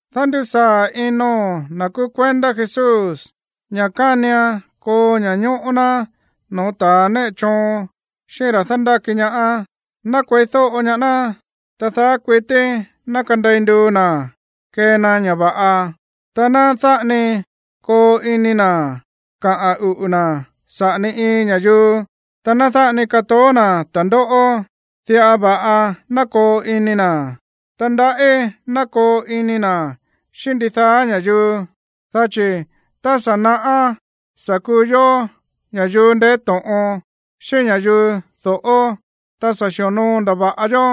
Dándusaa̱ ino̱n na̱ kúú kuendá Jesús ña̱ kánian koo ña̱ñóꞌó ná no̱ó ta̱ néꞌe choon xíꞌín ra̱ dándáki ñaá. Ná kueídóꞌo ñaá ná, ta daá kuití ná kandei nduu na̱ kee na ña̱ va̱ꞌa. Ta ná dáꞌa ni koo ini na̱ kaꞌa̱n uꞌu̱ na̱ saꞌa̱ ni iin ña̱yuu, ta ná dáꞌa ni katoó na̱ ta̱ndóꞌó. Diꞌa va̱ꞌa ná koo ini na̱, ta ndaꞌí ná koo ini na̱ xíꞌín ndidaá ña̱yuu. Dá chi̱ tá sa̱ naꞌá sa̱ kuu yó ña̱yuu ndeé to̱ꞌon, xíꞌín ña̱yuu do̱ꞌó, ta sa̱ xi̱onoo ndava̱ꞌa yó,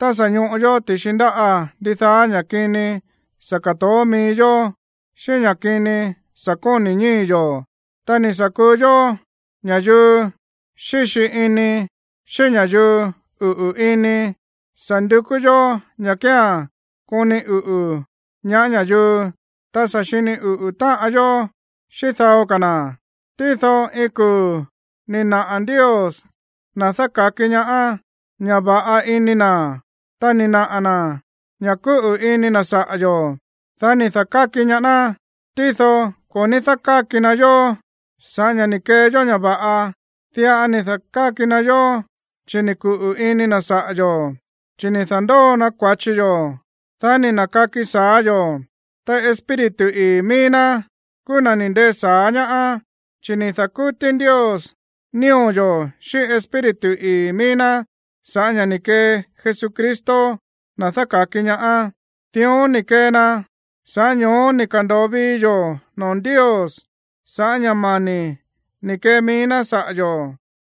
ta sa̱ ñoꞌo yó ti̱xi ndáꞌa̱ ndidaá ña̱ kini sa̱ ka̱toó mií yó xíꞌín ña̱ kini sa̱ koni̱ ñíi̱ yo̱. Ta ni̱ sa̱ kuu yó ña̱yuu xíxi ini, xíꞌín ña̱yuu uꞌu̱ ini. Sa̱ ndukú yó ña̱ kía̱n koni uꞌu̱ ñaá ña̱yuu, ta sa̱ xini uꞌu̱ táꞌan yó xíꞌín dao ka̱ na̱. Tído iin kuu̱ ni̱ naꞌa̱ Ndios, na̱ dáka̱ki ñaá, ña̱ va̱ꞌa ini na̱, ta ni̱ naꞌa̱ na̱ ña̱ kúꞌu̱ ini na̱ saꞌa̱ yo̱, dá ni̱ da̱káki ñaá ná. Tído ko̱ ní dákáki na yó sa̱ꞌá ña̱ ni̱ kee yó ña̱ va̱ꞌa. Diꞌa ni̱ da̱káki na yó chi̱ ni̱ kuꞌu̱ ini na̱ saꞌa̱ yo̱. Chi̱ ni̱ da̱ndóo na kua̱chi yó, dá ni̱ na̱kaki sa̱á yo̱, ta Espíritu ii̱ mií ná kúú na̱ ni̱ ndee sa̱á ñaá, chi̱ ni̱ da̱kútí Ndios nío̱ yo̱ xíꞌín Espíritu ii̱ mií ná sa̱ꞌá ña̱ ni̱ kee Jesucristo, na̱ dáka̱ki ñaá. Dión ni̱ kee na, sa̱ꞌá ño̱ó ni̱ ka̱ndo̱o vii yo̱ noo̱ Ndios sa̱ꞌá ña̱ mani̱ ni̱ kee mií ná saꞌa̱ yo̱,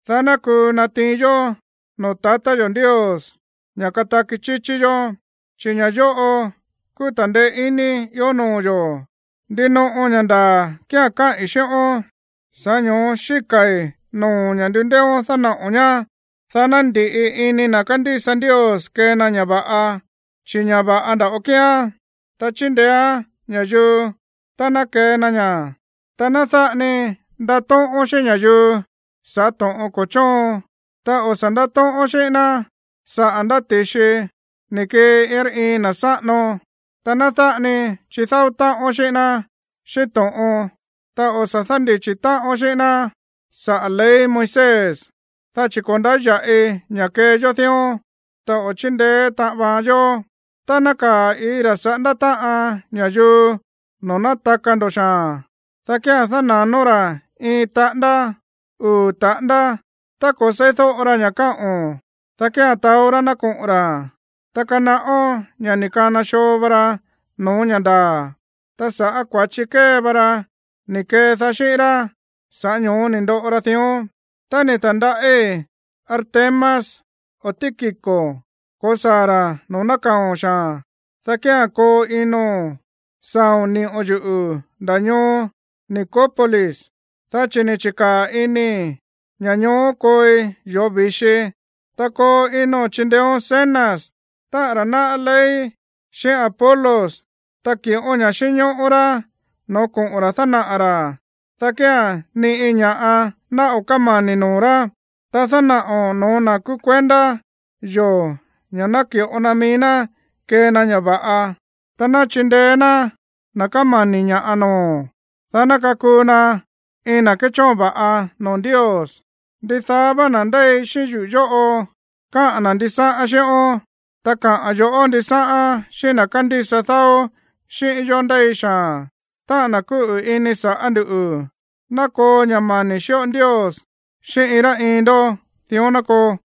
dá ná kuu natiin yó no̱ó tatá yo̱ Ndios ña̱ kataki chíchí yó, chi̱ ña̱ yóꞌo kúú ta̱ndeé iní ió noo̱ yo̱. Ndinoꞌo ña̱ ndaa̱ kía̱n káꞌi̱n xíꞌón, sa̱ꞌá ño̱ó xíka̱i̱ noo̱o̱n ña̱ ndundééón dánaꞌo̱n ñá, dá ná ndi̱ꞌi ini na̱ kándísa Ndios kee na ña̱ va̱ꞌa, chi̱ ña̱ va̱ꞌa nda̱ꞌo kíán, ta chíndeéán ña̱yuu tá ná kee na ña̱. Ta ná dáꞌa ni ndatóꞌón xíꞌín ña̱yuu sa̱ꞌá to̱ꞌon ko̱ chóon, ta o̱ sa̱ ndátóꞌón xíꞌín ná saꞌa̱ ndá ti̱xi ni̱ kii iin rá iin na̱ sáꞌano. Ta ná dáꞌa ni chidáó táꞌón xíꞌín ná xíꞌín to̱ꞌon, ta o̱ sa̱ dándichi̱ táꞌón xíꞌín ná saꞌa̱ ley Moisés, dá chi̱ ko̱ ndáya̱ꞌi ña̱ kee yó dión, ta o̱ chíndeé táꞌan vaan yó. Tá nákaa̱ iin ra̱ saꞌándá táꞌan ña̱yuu no̱ó nátaka ndo̱ xaa̱n, dá kía̱n dána̱nón ra̱ iin taꞌándá, uu̱ taꞌándá. Tá ko̱ seídóꞌo ra ña̱ káꞌo̱n, dá kía̱n taó rá ná koꞌo̱n ra̱, ta kanaꞌón ña̱ ni̱ kana xoo va ra no̱ó ña̱ ndaa̱, ta sa̱ꞌá kua̱chi kée vá rá ni̱ kedaá xíꞌín rá, sa̱ꞌá ño̱ó ni̱ ndoꞌo ra dión. Tá ni̱ ta̱ndaꞌí Artemas o Tíquico ko̱saa̱ ra̱ no̱ó nákaa̱o̱n xaa̱n, dá kía̱n koo ino̱n saa̱o̱n ni̱ꞌo̱n yuꞌu̱ ndá ñoo Nicópolis, dá chi̱ ni̱ chi̱kaa̱ inii̱ ña̱ ñoó kooi yoo̱ vi̱xi. Ta koo ino̱n chindeéón Zenas, táꞌa̱n ra̱ náꞌá ley, xíꞌín Apolos, ta ki̱ꞌón ña̱ꞌa xínñóꞌó rá no̱ó koꞌo̱n ra̱ dánaꞌa̱ ra̱, dá kía̱n ni iin ña̱ꞌa ná o̱ kámani̱ noo̱ rá. Ta dánaꞌo̱n no̱ó na̱ kúú kuendá yo̱ ña̱ naki̱ꞌo na mií ná kee na ña̱ va̱ꞌa, ta ná chindeé ná na̱ kámani̱ ña̱ꞌa noo̱, dá ná kakuu na iin na̱ kéchóon va̱ꞌa noo̱ Ndios. Ndidaá vá na̱ ndéi xíꞌín yuꞌu̱ yóꞌo káꞌa̱n ndisáꞌán xíꞌón. Ta kaꞌa̱n yo̱ꞌó ndisáꞌán xíꞌín na̱ kándísa dáó xíꞌín yó ndéi xaa̱n, táꞌa̱n na̱ kúꞌu̱ ini sa̱ꞌá nduꞌu̱. Ná koo ña̱ mani̱ xíꞌo Ndios xíꞌín iin rá iin ndó. Dión ná koo.